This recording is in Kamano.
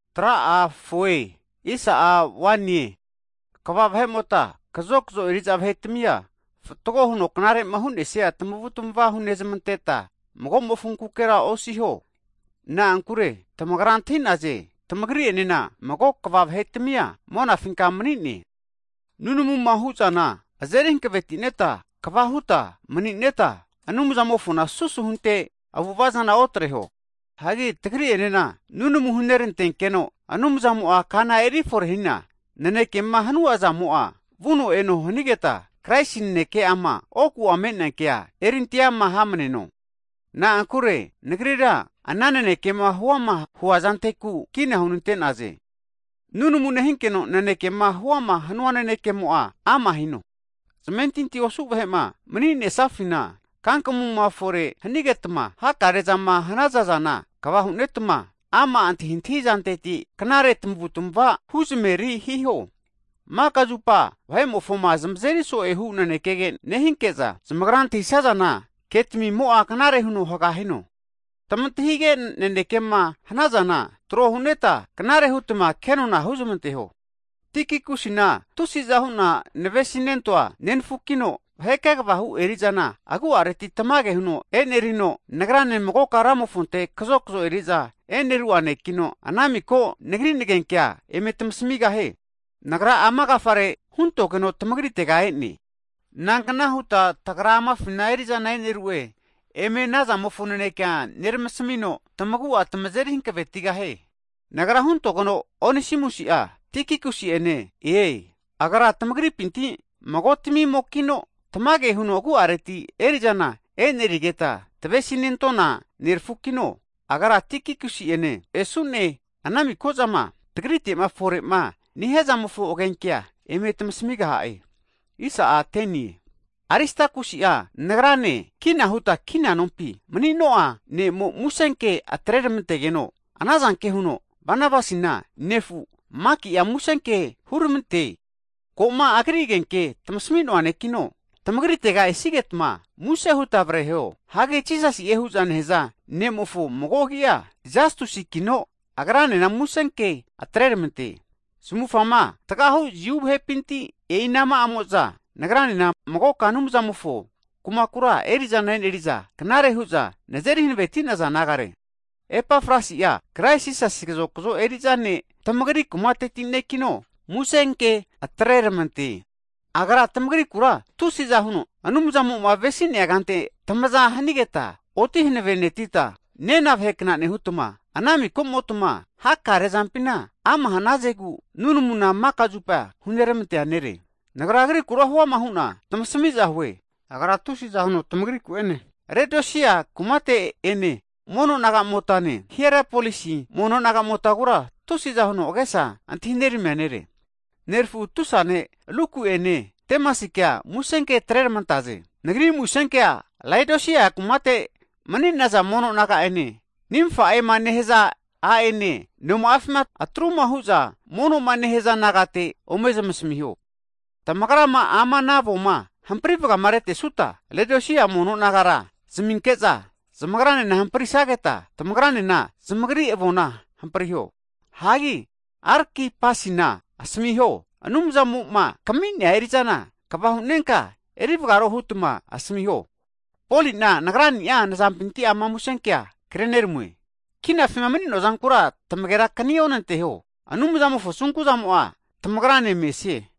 Hagi kva vahe'mota, kazokzo eri'za vahetamia fatgo huno knarema hu'nesia tamavutamava hunezmanteta magomofonkukera osiho. Na'ankure tamagra antahi'naze, tamagri'enena mago Kva vahetamia monafinka mani'ne. Nunamuma hu'zana azeri hankavetineta, kava huta mani'neta Anumzamofoma susu hunte avu'ava zana otreho. Hagi tagri'enena nunamu hunerantenkeno, Anumzamo'a kana erifore hina nanekema hanunazamo'a, vuno eno hanigeta, Kraisi naneke'ama oku me'nea kea erinteama hamneno. Na'ankure nagrira ana nanekema huama huazanteku kina hunante'naze. Nunamu nehinkeno nanekema huama hanua nanekemo'a, ama hino. Zamentinti osu vahe'ma maninesafina, kakamuma fore hanigetma hakarezama hanazana kva hunetma, ama antahintahi zanteti knare tamavutmava huzamaveri hiho. Maka zupa vahe'mofoma zamazeri so'ehu nanekege nehinke'za, zamagrama antahisazana, ketamimo'a knare huno haga hino. Tamantahige nanekema hanazana, trohuneta knare hutma kenona huzamanteho. Hagi Tikikusina, tusi'za hu'na navesinentoa nenafukino, vahe kegavahu eri'zana agu'areti tamage huno e'nerino, nagrane magoka Ramofonte kazokzo eri'za eneru'a nekino, ana miko nagri nagenkea eme tamasamigahie. Nagra ama agafare huntogeno tamagritega e'ne. Nankna huta tagra amafina eri'zana e'nerune, anazamofo naneke eme neramasamino tamagu'a tamazeri hankavetigahie. Nagra huntogeno Onesimusi'a Tikikusi'ene ne-e. Agra tamagripinti magotamimokino, tamage huno agu'areti eri'zana enerigeta tavesinentona nerafukino, agra Tikikusi'ene esu'ne ana miko'zama tagrite'ma fore'ma nehiazamofo agenkea eme tamasamigaha'e. Hagi Aristakusi'a nagrane kina huta kina nompi manino'a ne'mo musenke atreneramantegeno, anazanke huno Banabasina nefu, Maki'a musenke huramante. Ko'ma agri agenkea tamasmi'noa nekino, tamagritega esigetma muse hutma avreho. Hagi Jisasi'e hu'za nehaza ne'mofo mago agi'a Jastusikino, agranena musenke atreramante. Zamuvufga tgahu Jiu vahepinti e'inama'amo'za nagranena magoka Anumzamofo kumakura eri'zana eneri'za knare hu'za nazeri hanaveneti'za nagare. Epafrasi'a Krais Jisasi kazokzo eri'za ne' tamagri kumateti nekino, musenke atreramante. Agra tamagrikura tusi'za huno, Anumzamo'ma avesinea kante tamaza hanigeta oti hanavenetita, nena vahekna nehutma ana mikomotma hakare zampina ama hanazegu nunamuna maka zupa huneramantea nere. Nagra agrikura huama hu'na tamasamiza hue, agra tusiza huno tamagriku'ene Laodisia kumatea mono nagamotane, Hierapolisi mono nagamotagura tusi'za huno agesa antahineramia nere. Nerafu tusa ne' Luku'ene Demasikea musenke atreramanta'e. Nagri musenkea Laodisia kumate mani'naza mono naga'ene Nimfa'ema nehaza a'ene noma'afima atruma hu'za mono'ma nehaza nagara ome zmasamiho. Tamagrama ama ana avoma hampri vagamaretesuta, Laodisia mono nagara zaminke'za zamagranena hamprisageta, tamagranena zamagri avona hampriho. Hagi Arkipasina asamiho, Anumzamo'ma kami'nea eri'zana kva hu'nenka erivagaro huta asamiho. Poli'na nagrani'a nazampinti ama musenkea kreramue. Kinafima mani'noa zankura tamagera kanionanteho. Anumzamofo Asunkuzamo'a tamagrane mesie.